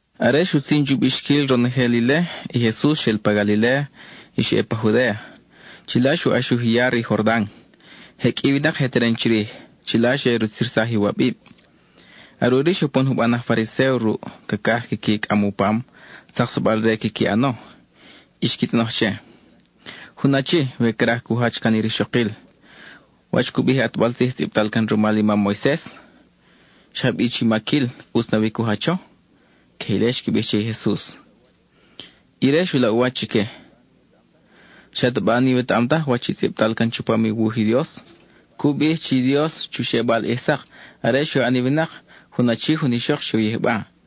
Are xutzin chu bixquil ronojel ile, i Jesus xel pa Galiléa y xa ʼe pa Judéa. Chila xu ʼaxuj i ya re i Jordan. Je qʼui i winak je teren chirij; chila xe rutzirsaj iwabib. Are ʼuri xe upon juban aj Fariséo ruʼ; cacaj quiqui cʼam u pam, tzaksabal-re quiqui ʼano. Y xqui tzʼonoj che: —Jun achi, we craj cu jach can i rixokil, ¿wach cu bij i ʼatbal tzij tzʼibtal can rumal i mam Moises? ¿Xa bi chi maquil ʼutz nawi cu jacho? Queje ile xqui bij che i Jesus. Ire xu laʼ u wach chique: —¿Xataba n-iwetaʼam taj wach i tzʼibtal can chupam u wuj i Dios? Cu bij chi i Dios chu xebal ʼij sak, are xe u ʼan i winak, “jun achi, jun ixok xe u yijba.”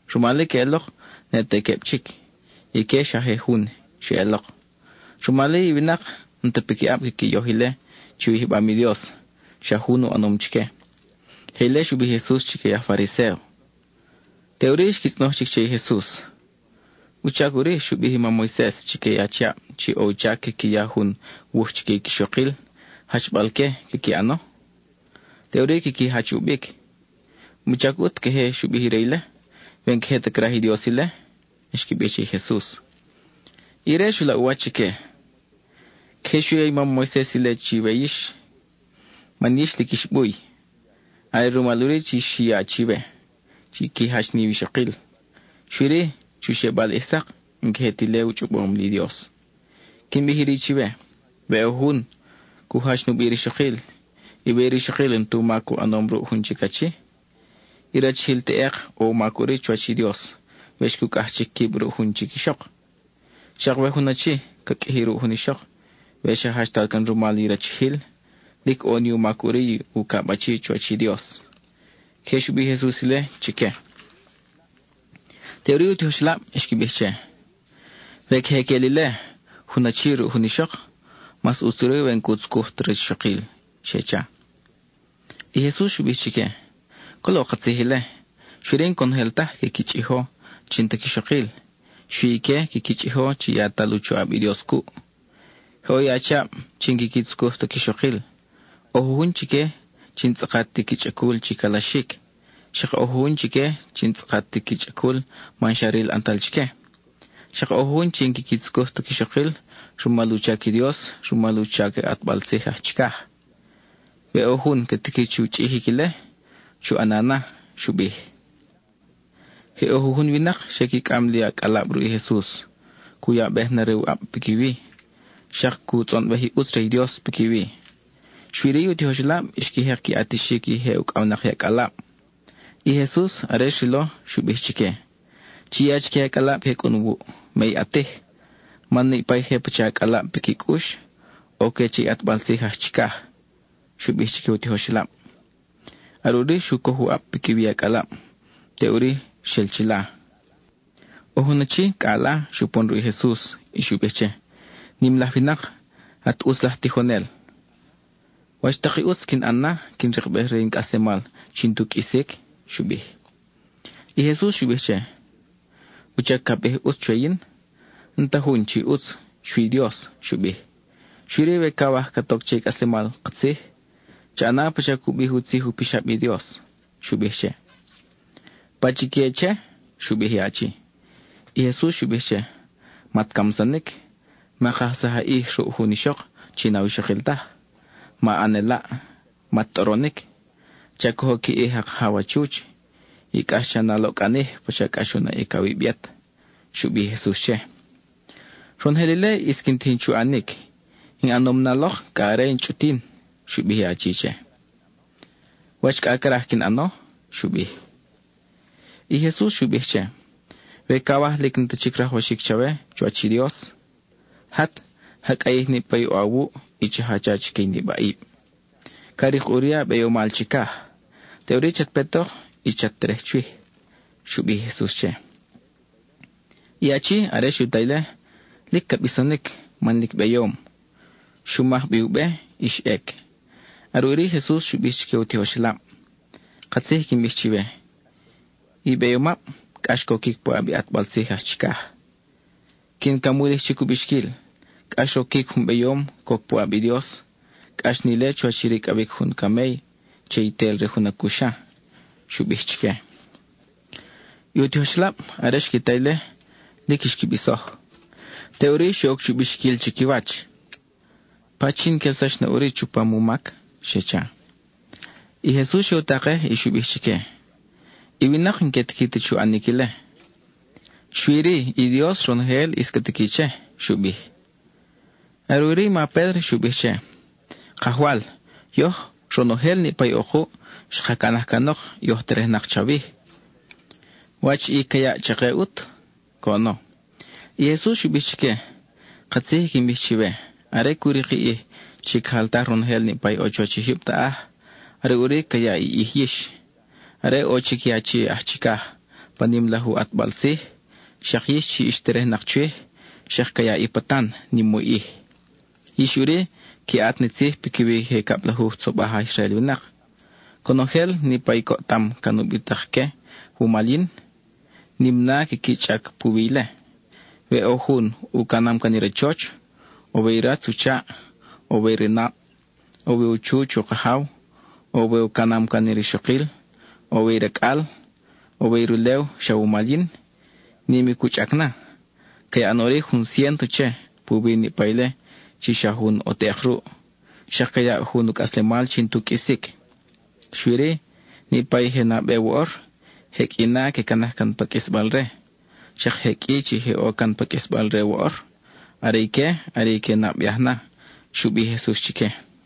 Rumal-i queʼelok ne te queb chic, ique xa je jun xeʼelok. Rumal-i i winak, n-ta piquiʼab quiqui yoj ile chi u yijbam i Dios xa jun u ʼanom chique. (Queje ile xu bij i Jesus chique i aj Fariséo.) Teʼuri xqui tzʼonoj chic che i Jesus: —¿Wuchac ʼuri xu bij i mam Moises chique i achiab chi ʼo u chac quiqui ya jun wuj chique i quixokil, jachbal-que quiqui ʼano? Teʼuri quiqui jach ʼu bic. ¿Wuchac ʼut queje xu bij ire ile, we n-queje ta craj i Dios ile? —xqui bij che i Jesus. Ire xu laʼ u wach chique: —Queje xu ya i mam Moises ile chiwe man yix lic ix buy. Are rumal ʼuri chi xu ya chiwe qui jach ni iwixokil. Xui-ri, chu xebal ʼij sak, n-queje ti ile u chʼobom li Dios. Quin bij iri chiwe: we ʼo jun cu jach nubi i rixokil, y we i rixokil n-tu mac u ʼanom ruʼ jun chic achi, i rachijil teʼek ʼo u mac ʼuri chuwach i Dios we xcucʼaj chic quib ruʼ jun chic ixok. Xak we jun achi ca qʼuiji ruʼ jun ixok we xa jachtal can rumal i rachijil, lic ʼo ni u mac ʼuri i ucab achi chuwach i Dios. (Queje xu bij i Jesus ile chique.) Teʼuri i u tijoxelab xqui bij che: —We queje queʼel ile, jun achi ruʼ jun ixok, mas ʼutz ʼuri we n-cu tzucuj ta rixokil —xe cha. I Jesus xu bij chique: —Colo katzij ile, xui-ri n-conojel taj quiqui chʼijo chi n-ta quixokil; xui ique quiqui chʼijo chi yatal u choʼab i Dios cuʼ. Je ʼo i achiab chi n-quiqui tzucuj ta quixokil: ʼo jujun chique chi n-tzʼakat ti qui chʼacul chi calaxic; xak ʼo jujun chique chi n-tzʼakat ti qui chʼacul man xa ril ʼantal chique; xak ʼo jujun chi n-quiqui tzucuj ta quixokil rumal u chac i Dios, u chac i ʼatbal tzij aj chicaj. We ʼo jun ca tiqui chu chʼijic ile, chu ʼana na —xu bij. Je ʼo jujun winak xe qui cʼam li acʼalab ruʼ i Jesus, cu yabej na re u ʼab piquiwi, xak cu tzʼonbej i ʼutz re i Dios piquiwi. Xui-ri, i u tijoxelab xqui jek qui ʼatixic i je ucʼawnak i acʼalab. I Jesus, are xrilo, xu bij chique: —Chi ya chique i acʼalab que cʼun wuʼ; me i ʼatij, man niʼpa i je pacha acʼalab piqui cʼux, ʼo-que che i ʼatbal tzij aj chicaj —xu bij chique u tijoxelab. Are ʼuri xu coj u ʼab piquiwi i acʼalab; teʼuri xel chila. ʼO jun achi, cʼa ala, xupon ruʼ i Jesus y xu bij che: —Nim laj winak, at ʼutz laj tijonel, ¿wach tak i ʼutz quin ʼan na, quin rikbej re in cʼaslemal chi n-tu qʼuisic? —xu bij. I Jesus xu bij che: —¿Wuchac ca bij “ʼutz” chwe yin? N-ta jun chi ʼutz, xui Dios —xu bij—. Xui-ri we cawaj cat oc che i cʼaslemal katzij, cha ʼana pacha cu bij u tzij u pixab i Dios —xu bij che. —¿Pachique che? —xu bij i achi. I Jesus xu bij che: —Mat camsanic; ma kajsaj a ʼij ruʼ jun ixok chi n-awixokil taj; ma ʼan elaʼ; mat tʼoronic; cha cojo qui ʼij a kajaw a chuch; y cʼax cha na a loʼcʼanij pacha cʼax u naʼic awib yet —xu bij i Jesus che. —Ronojel ile ʼis quin tijin chu ʼanic; in ʼanom na lok cʼa are in chʼutin —xu bij i achi che—. ¿Wach cʼa craj quin ʼano? —xu bij. I Jesus xu bij che: —We cawaj lic n-ta chic rajwaxic chawe chuwach i Dios, jat, ja cʼayij niʼpa i ʼo awuʼ, y cha jacha chique i nibaʼib. Ca rik ʼuri a beyomal chicaj. Teʼuri chat petok y chat terej chwij —xu bij i Jesus che. I achi, are xu ta ile, lic ca bisonic, man lic beyom; xu maj bi u be, y xa ʼec. Are ʼuri i Jesus xu bij chique i u tijoxelab: —Katzij i quin bij chiwe: i beyomab, cʼax coquic puʼab i ʼatbal tzij aj chicaj. Quin camulij chic u bixquil: cʼax roquic jun beyom, coc puʼab i Dios; cʼax ni ile chuwach i ricʼawic jun camey che i tel re jun acuxa —xu bij chique. I u tijoxelab, are xqui ta ile, lic xqui bisoj. Teʼuri xe oc chu bixquil chiquiwach: —¿Pachin quelsax na ʼuri chupam u mac? —xe cha. I Jesus xe u takej y xu bij chique: —I winak n-que tiqui ta chu ʼanic ile; xui-ri i Dios ronojel ʼis ca tiqui che —xu bij. Are ʼuri i ma Pédro xu bij che: —Kajwal, yoj, ronojel niʼpa i ʼo kuʼ, xka canaj canok y oj terejnak chawij. ¿Wach i ca yaʼ chake ʼut? —coʼono. I Jesus xu bij chique: —Katzij i quin bij chiwe, are cu rik i ʼij chi ca jaltaj ronojel niʼpa ʼo chuwach i jyub taʼaj, are ʼuri ca yaʼ i ʼij yix. Are ʼo chic i Achi aj Chicaj pa nim laj u ʼatbal tzij, xak yix chi ix terejnak chwij xak ca yaʼ i patan nim u ʼij. Yix ʼuri qui ʼat ni tzij piquiwi i je cablajuj tzobaj aj Israel winak. Conojel niʼpa i coʼtam can ubitak-que wumal yin, nim na quiqui chʼac puwi ile. We ʼo jun u canam can i rachoch, o we i ratz u chaʼ, o we i ranab, o we u chuch u kajaw, o we u canam can rixokil, o we i racʼal, o we i rulew xa wumal yin, nim i cu chʼac na. Ca yaʼ na ʼuri jun ciénto che, puwi niʼpa ile chi xa jun ʼo teʼek ruʼ, xak ca yaʼ jun u cʼaslemal chi n-tu qʼuisic. Xui-ri, niʼpa i je nabe woʼor, je qʼui na que canaj can pa qʼuisbal-re; xak je qʼui chi je ʼo can pa qʼuisbal-re woʼor, are ique are i que nabeaj na —xu bij i Jesus chique.